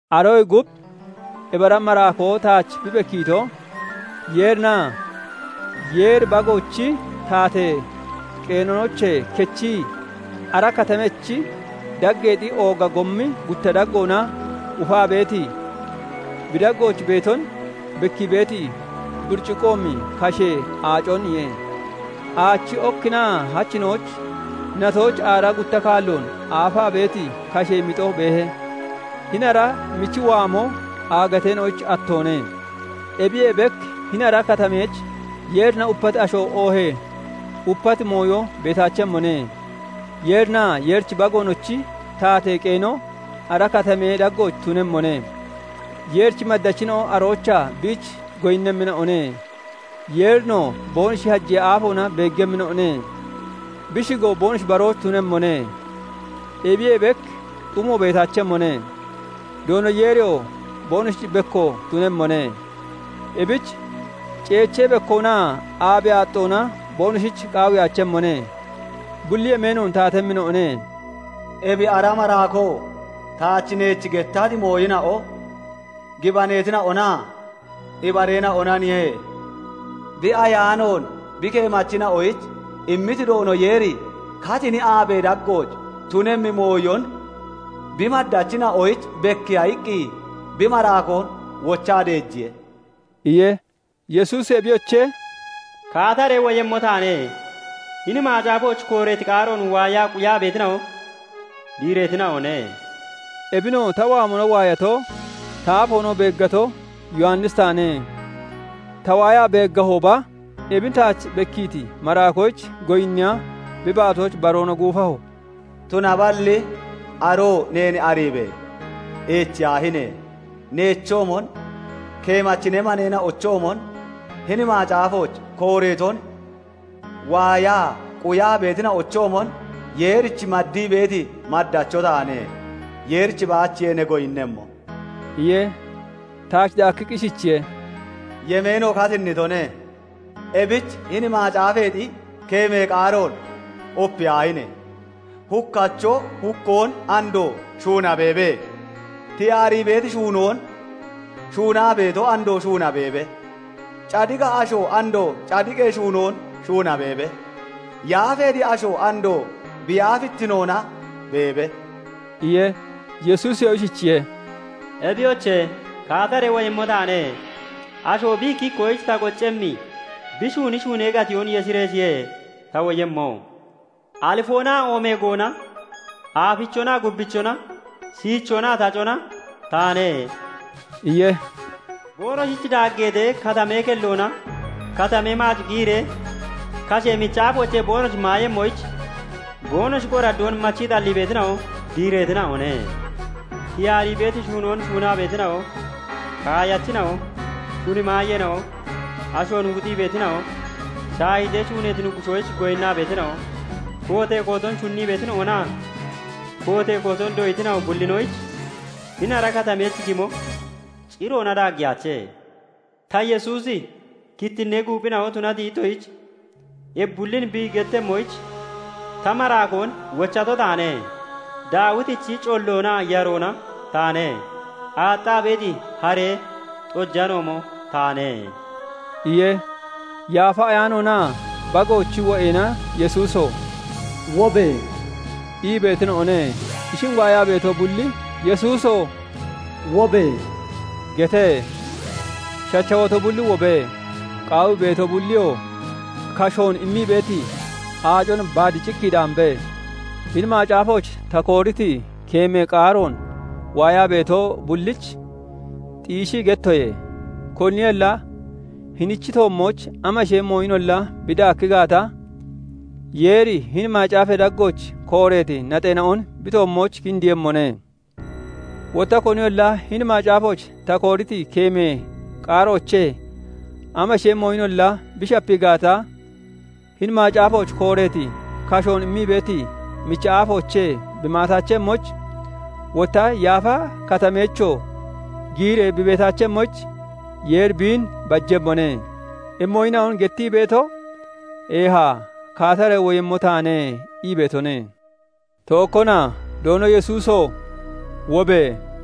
Aroyee gub ebi ara maraakoo taach bi bekkiito, Yeerinaa Yeeri Bagoonochi taatee qeenoochee kechii, ara katamechi daggeexi ooga gommi gutta daggoona ufaa beeti, bi daggooch beeton bekkii beeti buriciqoomi kashee aaconiye; aachi okkinaa hachinooch natooch aaraa gutta kaalloon aafaa beeti kashee mixo beehe; hini ara michi waamo aagateena'oyich attoone. Ebiyee bek hini ara katameech Yeerina upati asho oohee upati mooyo beetaachemmone; Yeerinaa Yeerichi Bagoonochi taatee qeeno ara katamee daggooch tunemmone; Yeerichi maddachina'o aroochaa biich goyinnemmina'one Yeerinoo boonoshi hajee aafoona beeggemmina'one; bi shigoo boonoshi barooch tunemmone. Ebiyee bek xumo beetaachemmone; Doono Yeeriyoo boonoshich bekko tunemmone; ebich ceechee bekkoonaa aabee aaxxoona boonoshich qaawiyaachemmone; bulli yemeenoon taatemmina'one. Ebi ara maraakoo taach Neech gettati mooyina'o gibaneetina'onaa ibareena'onaniye; bi Ayaanoon bi keemachina'oyich immiti Doono Yeeri katini aabee daggooch tunemmi mooyon bi maddachina'oyich bekkiiya iqqi bi maraakoon wochaa deejiye" iye. Yesuusi Ebiyoche! Kaataree woyemmo taane; hini macaafooch kooreeti qaaroon waayaa quyaa beetina'o diireetina'one" iye. Ebinoo ta waamona waayato, ta aafoonoo beeggato, Yowannisi taane; ta waayaa beeggahooba, ebin taach bekkiiti maraakoyich goyinniya bi baatooch baroona guufaho. Tunaballi aroo Neen ariibe! Eechiyaahine! Neechoomon, keemachi ne maneena'ochoomon, hini macaafooch kooreeton waayaa quyaa beetina'ochoomon Yeerich maddii beeti maddacho taane; Yeerich baachiye ne goyinnemmo!" iye. Taach daakkiqqi ishichiye:- Yemeeno katinnitone; ebich hini macaafeexi keemee qaaroon opiyaahine! Hukkacho hukkoon andoo shuuna beebe; tiyaarii beeti shuunoon shuunaa beeto andoo shuuna beebe; cadiqa asho andoo cadiqee shuunoon shuuna beebe; yaafeeti ashoo andoo bi yaafittinoona beebe" iye. Yesuusiyoo ishichiye:- Ebiyoche! Kaataree woyemmo taane; asho bi ikki ikkoyich ta qoccemmi bi shuuni shuunee gatiyoon yeshireeshiye ta woyemmo. Alifoonaa Oomeegoona, Aafichonaa Gubbichona, Shiichoonaa Tacona taane" iye. Boonoshich daaggeetee, katamee kelloona katamee maac giyiree kashee michi aafoochee boonoshi maayemmoyich, boonoshi qoraddoon machii xallii beetina'o diireetina'one. Tiyaarii beeti mooyon shuunaa beetina'o, kaayachina'o, shuni maayeena'o, ashoon wuxii beetina'o, shaahiitee shuuneeti nuggushoyich goyinnaa beetina'o, kootee kooton shunnii beetina'onaa kootee kooton doyitina'o bullinoyich hini ara katameech gimo ciroona daaggeyaache. Ta Yesuusi kittinnee guuphina'o tunati ittoshich ebi bullin bi gettemmoyich ta maraakoon wochato taane. Daawitichi colloonaa yaroona taane; aaxxaa beeti haree xojanoomo taane" iye. Yaafa Ayaanoonaa Bagoochi wo'eena Yesuuso! Wobe! ii beetina'one. Ishin waayaa beeto bulli Yesuuso! Wobe! gete. Shachawato bulli wobe; qaawii beeto bulliyoo kashoon immii beeti aacon baad cikki daambe. Hini macaafooch ta kooriti keemee qaaroon waayaa beeto bullich xiishii gettoye; koniyolla hinichi toommooch amashee mooyinolla bi daakki gaata, Yeeri hini macaafee daggooch kooreeti naxeena'on bi toommooch kindiiyemmone. Wotta koniyolla hini macaafooch ta kooriti keemee qaaroochee amashee mooyinolla bi shapii gaata, hini macaafooch kooreeti kashoon immii beeti michi aafoochee bi maataachemmoyich, wotta yaafa katameechoo giyiree bi beetaachemmoyich, Yeeri biin bajemmone. Ebi mooyina'on gettii beeto Eeha; kaataree woyemmo taane ii beetone. Tookkona; Doono Yesuuso! Wobe!